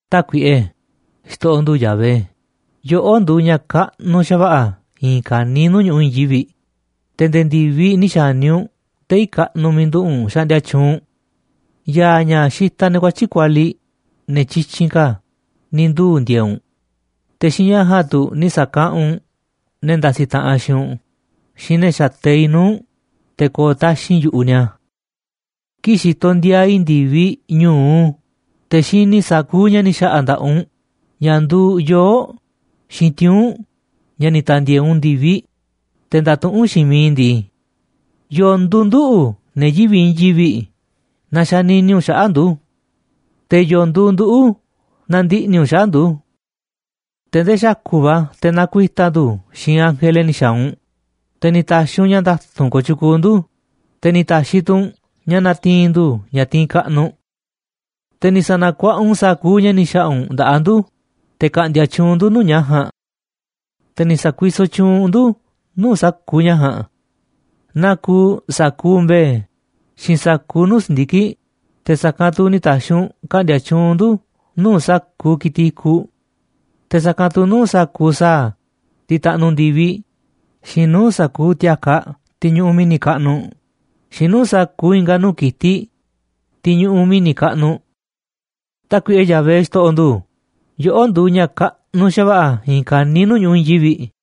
Tákuiꞌe, xto̱ꞌo̱ ndu̱ Yahvé, yoꞌó nduuꞌ ña̱ kaꞌnuꞌ xa̱va̱ꞌa̱ i̱i̱n ka̱niiꞌ nuu̱ꞌ ñu̱ꞌuꞌ i̱i̱n yivi̱ꞌ, te̱ nde̱e̱ ndi̱viꞌ ni̱ xa̱ni̱ u̱nꞌ tei̱ kaꞌnuꞌ miiꞌ nduꞌu̱ꞌ u̱nꞌ xaꞌndia tyuunꞌ u̱nꞌ. Ya̱a̱ ña̱ xitaꞌ ne̱ kuatyi̱ꞌ kualiꞌ, ne̱ tyityinꞌ ka̱, ni̱ nduuꞌ ndi̱e̱e̱ꞌ u̱nꞌ, te̱ xiinꞌ ña̱ ja̱a̱nꞌ tu̱ ni̱ sa̱kaꞌanꞌ u̱nꞌ ne̱ ndasiꞌ taꞌanꞌ xiinꞌ u̱nꞌ xiinꞌ ne̱ xateiꞌ nuu̱ꞌ u̱nꞌ, te̱ ko̱o̱ taxi̱nꞌ yu̱ꞌuꞌ ni̱a̱. Kii̱ꞌ xitoꞌ ndiaa i̱ ndi̱viꞌ ñu̱u, te̱ xini i̱ sa̱kuuꞌ ña̱ ni̱ xa̱ꞌa̱ nda̱ꞌaꞌ u̱nꞌ, ña̱ nduuꞌ yoo̱ꞌ xiinꞌ tiuu̱nꞌ, ña̱ ni̱ ta̱ndi̱e̱e̱ u̱nꞌ ndi̱viꞌ, te̱ ndatuꞌúnꞌ xiinꞌ miiꞌ i̱ ndii: ¿Yo̱o̱ nduuꞌ nduꞌu̱, ne̱ yivi̱ꞌ i̱i̱n yivi̱ꞌ, na xanini u̱nꞌ xaꞌa̱ꞌ ndu̱? Te̱, ¿yo̱o̱ nduuꞌ nduꞌu̱ na ndiꞌni̱ u̱nꞌ xaꞌa̱ꞌ ndu̱? Te̱ ndee xa̱ku̱ꞌ va̱ te̱ na̱kuita̱ ndu̱ xiinꞌ ángele ni̱ xa̱a̱ u̱nꞌ, te̱ ni̱ ta̱xi̱ u̱nꞌ ña̱ nda̱tu̱nꞌ kooꞌ tyukuuꞌ ndu̱, te̱ ni̱ ta̱xi̱ tu̱ u̱nꞌ ña̱ na̱ti̱i̱n ndu̱ ña̱ tiinꞌ kaꞌnuꞌ. Te̱ ni̱ sa̱na̱kuaꞌa u̱nꞌ sa̱kuuꞌ ña̱ ni̱ xa̱ꞌa̱ u̱nꞌ nda̱ꞌaꞌ ndu̱, te̱ ka̱ꞌndi̱a̱ tyuunꞌ ndu̱ nuu̱ꞌ ña̱ ja̱a̱nꞌ. Te̱ ni̱ sa̱kuisoꞌ tyuunꞌ u̱nꞌ ndu̱ nuu̱ꞌ sa̱kuuꞌ ña̱ ja̱a̱nꞌ. Naa kuuꞌ sa̱kuuꞌ mbe̱e̱ xiinꞌ sa̱kuuꞌ nuu̱ꞌ si̱ndiki̱ꞌ, te̱ sa̱kanꞌ tu̱ ni̱ ta̱xi̱ u̱nꞌ ka̱ꞌndi̱a̱ tyuunꞌ ndu̱ nuu̱ꞌ sa̱kuuꞌ ki̱tiꞌ i̱kuꞌ. Te̱ sa̱kanꞌ tu̱ nuu̱ꞌ sa̱kuuꞌ sa̱a̱, tiꞌ taꞌnuꞌ ndi̱viꞌ, xiinꞌ nuu̱ꞌ sa̱kuuꞌ ti̱a̱kaꞌ tiꞌ ñuꞌuꞌ mi̱ni̱ kaꞌnuꞌ, xiinꞌ nuu̱ꞌ sa̱kuuꞌ i̱nga̱ nuu̱ꞌ ki̱tiꞌ, tiꞌ ñuꞌuꞌ mi̱ni̱ kaꞌnuꞌ. Tákuiꞌe Yahvé, xto̱ꞌo̱ ndu̱, yoꞌó nduuꞌ ña̱ kaꞌnuꞌ xa̱va̱ꞌa̱ i̱i̱n ka̱niiꞌ nuu̱ꞌ ñu̱ꞌuꞌ i̱i̱n yivi̱ꞌ.